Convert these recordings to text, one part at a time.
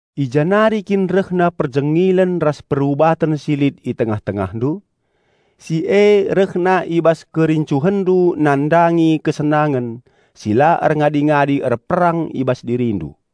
I ja nari kin rehna perjengilen ras perubaten si lit i tengah-tengahndu? Si e rehna i bas kerincuhenndu nandangi kesenangen, si la erngadi-ngadi erperang i bas dirindu.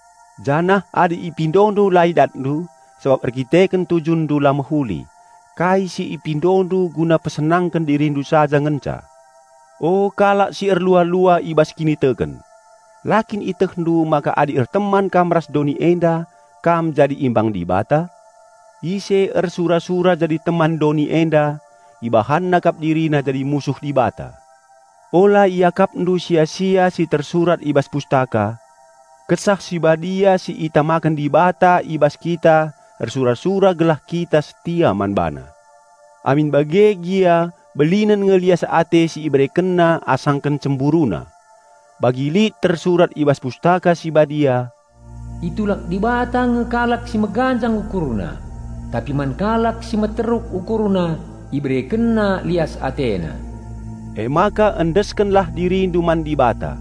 Janah adi ipindondu la idatndu, sabap erkiteken tujunndu la mehuli; kai si ipindondu guna pesenangken dirindu saja ngenca. O kalak si erlua-lua i bas kiniteken! La kin ietehndu maka adi erteman kam ras doni enda, kam jadi imbang Dibata? Ise ersura-sura jadi teman doni enda, ibahanna kap dirina jadi musuh Dibata. Ula iakapndu sia-sia si tersurat i bas Pustaka, "Kesah Si Badia si itamaken Dibata i bas kita ersura-sura gelah kita setia man BaNa." Amin bage gia belinen nge lias ate si IberekenNa asangken CemburuNa. Bagi lit tersurat i bas Pustaka Si Badia, "Itulak Dibata nge kalak si meganjang ukurna, tapi man kalak si meteruk ukurna IberekenNa lias AteNa." Emaka endeskenlah dirindu man Dibata.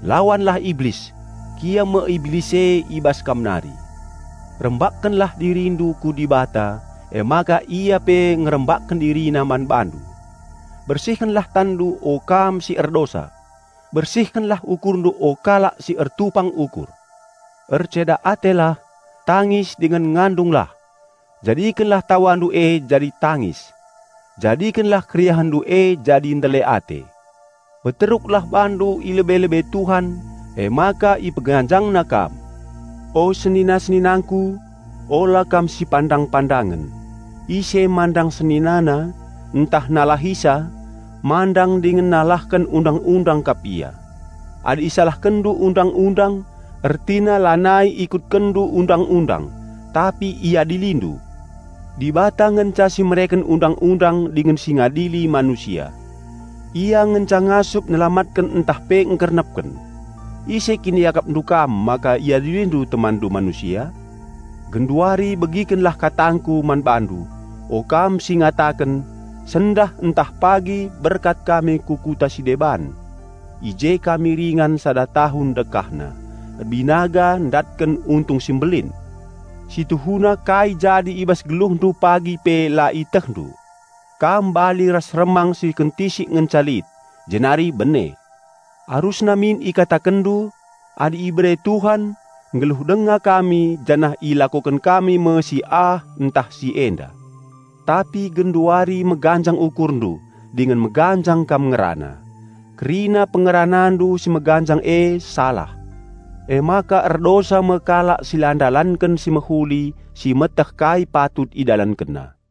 Lawanlah Iblis; kiam me Iblis e i bas kam nari. Rembakkenlah dirindu ku Dibata, emaka Ia pe ngerembakken DiriNa man bandu. Bersihkenlah tanndu o kam si erdosa! Bersihkenlah ukurndu o kalak si ertupang ukur! Erceda atelah, tangis dingen ngandunglah; jadikenlah tawandu e jadi tangis; jadikenlah keriahenndu e jadi ndele ate! Peteruklah bandu i lebe-lebe Tuhan, emaka IpeganjangNa kam. O senina-seninangku, ula kam sipandang-pandangen. Ise mandang seninana, ntah nalahisa, mandang dingen nalahken Undang-undang kap ia. Adi isalahkenndu Undang-undang, ertina lanai ikutkenndu Undang-undang, tapi iadilindu. Dibata ngenca si mereken Undang-undang dingen si ngadili manusia. Ia ngenca ngasup nelamatken ntah pe ngkernepken. Ise kin iakapndu kam maka iadilindu temanndu manusia? Genduari bagikenlah katangku man bandu, o kam si ngataken, "Sendah ntah pagi berkat kami ku kuta si deban; i je kami ringan sada tahun dekahna, erbinaga ndatken untung si mbelin." Si tuhuna kai jadi i bas geluhndu pagi pe la ietehndu! Kam bali ras remang si kentisik ngenca lit, jenari bene. Arusna min ikatakenndu, "Adi ibere Tuhan, nggeluh denga kami janah ilakoken kami me si ah ntah si enda." Tapi genduari meganjang ukurndu dingen meganjang kam ngerana. Kerina pengeranandu si meganjang e salah. Emaka erdosa me kalak si la ndalanken si mehuli si etehna patut idalankenna.